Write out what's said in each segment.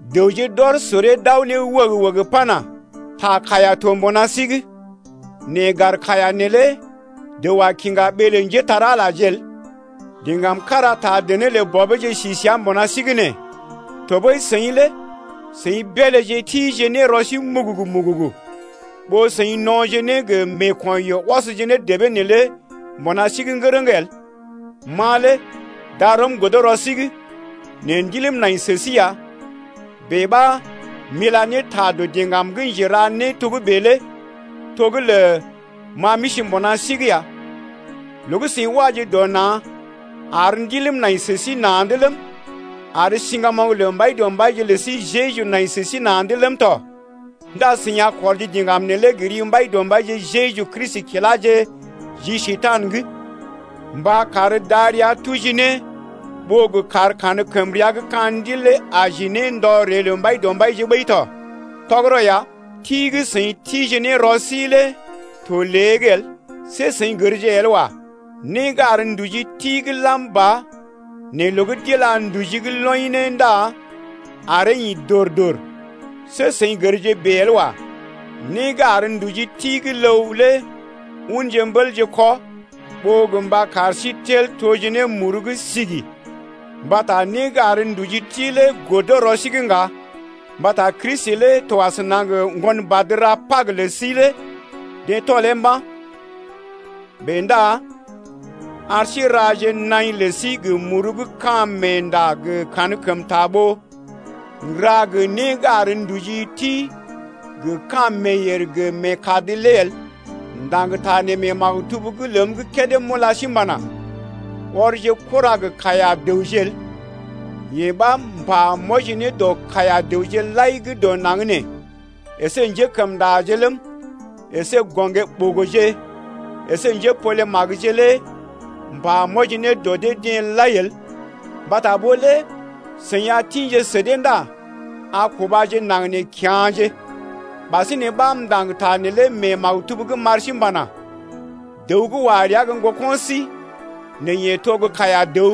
Dəwje d’ɔr soree d’aw ne wəg-wəg pana: Ta kaiya to mbuna sí’g, nɛ gar kaiya neelé dəw a kiŋga bèe ɓee lə njépole-magəje el. Diŋgam kára taa dené lə bɔbeeje si səa mbuna sí’g nee. Tɔɓəi seḭ lé seḭ beelé tije ne rɔ sí mugugu-mugugu, ɓó seḭ no̰je ne gə meeko̰yoo ɔsje ne debee neelé mbuna sí’g ŋgərəŋ el. Ma lé darɔm godo rɔ sí’g, nɛ ndiləm nai sə sí ya. Bèe ɓa m’ila ne ta dɔ diŋgam gə́ njera né togə́bè’g lé to gə́ lə ma m’isi mbuna sí’g ya. Loo gə́ seḭ waje dɔ na̰ ar ndiləm nai sə sí na̰’d ləm, ar siŋgamoŋ lə Mbaidɔmbaije lə sí Jeju nai sə sí na̰’d ləm tɔ ndá seḭ a kɔrje diŋgam neelé gə ri Mbaidɔmbaije Jeju kiláje ji Njekurai’g mba kar darəa tuji ne ɓó gə kar kankəmrea gə́ ka̰ ndil lé aji ne ndɔ ree lə Mbaidɔmbaije ɓəi tɔ. Tɔgərɔ ya, ti gə́ seḭ tije ne rɔ sí lé to lée’g el. See seḭ gərje el wa, né gə́ ar nduji ti gə́ lam ba nɛ loo gə́ d’ila nduji’g loḭ ne ndá aree ḭ dor-dor. See seḭ gərje bèe el wa. Né gə́ ar nduji ti gə́ ləw lé unje mbélje kɔ ɓó gə mba kar sí tel toje ne muru gə́ sigi mbata né gə́ ar nduji ti lé godo rɔ sí’g ŋga, mbata Kristi lé to asəna gə ŋgonbad ra Pag lə sí lé deḛ tɔlee mba̰. Bèe ndá ar sí n’raje naḭ lə sí gə muru gə́ ka̰ meenda gə kankəmta ɓó n’ra gə né gə́ ar nduji ti gə ka̰ meeyèr gə meekad lé el. M’ndaŋg ta mee maktub’g ləm gə́ kédé m’ula sí m’pana: Ɔrje kura gə́ kaiya-dəwje el. Yee ɓa m’pa m’wɔji ne dɔ kaiya-dəwje lai gə́ dɔ naŋg nee əsé njékəmndaje ləm, əsé gɔŋgé-ɓogoje əsé njépole-magəje lé m’pa m’wɔji ne dɔ dee-deḛ lai el, mbata ɓó lé seḭ a gə tḭje sə dee ndá a kubaje naŋg nee kya̰je. Ɓasinè ɓa m’ndaŋg ta neelé mee maktub’g m’ar sí m’pana: Dəw gə́ wa rəa gə́ ŋgoko̰ sí nɛ yeḛ to kaiya-dəw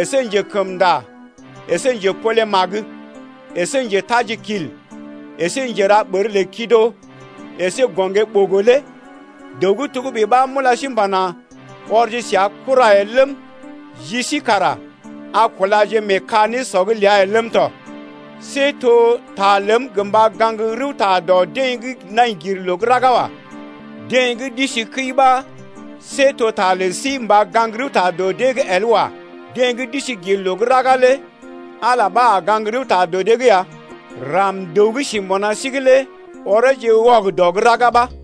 əsé njekəmnda əsé njepolemagje əsé njetajikil əsé njera ɓər lə kido əsé gɔŋgé-ɓogo lé dəw gə́ togə́bè ɓa m’ula sí m’pana: Ɔrje səa kura el ləm, ji sí kara a kulaje mee ka nésɔ’g ləa el ləm tɔ. See to ta ləm gə mba gaŋg rəwta dɔ deḛ gə́ nai gir loo gə́ raga wa. Deḛ gə́ d’isi kəi ɓa to ta lə sí mba gaŋg rəwta dɔ dee’g el wa. Deḛ gə́ d’isi gir loo gə́ raga lé Ala ɓa a gaŋg rəwta dɔ dee’g ya. Ram-dəw gə́ si mbuna sí’g lé oreeje wɔgədɔ gə́ raga ɓa.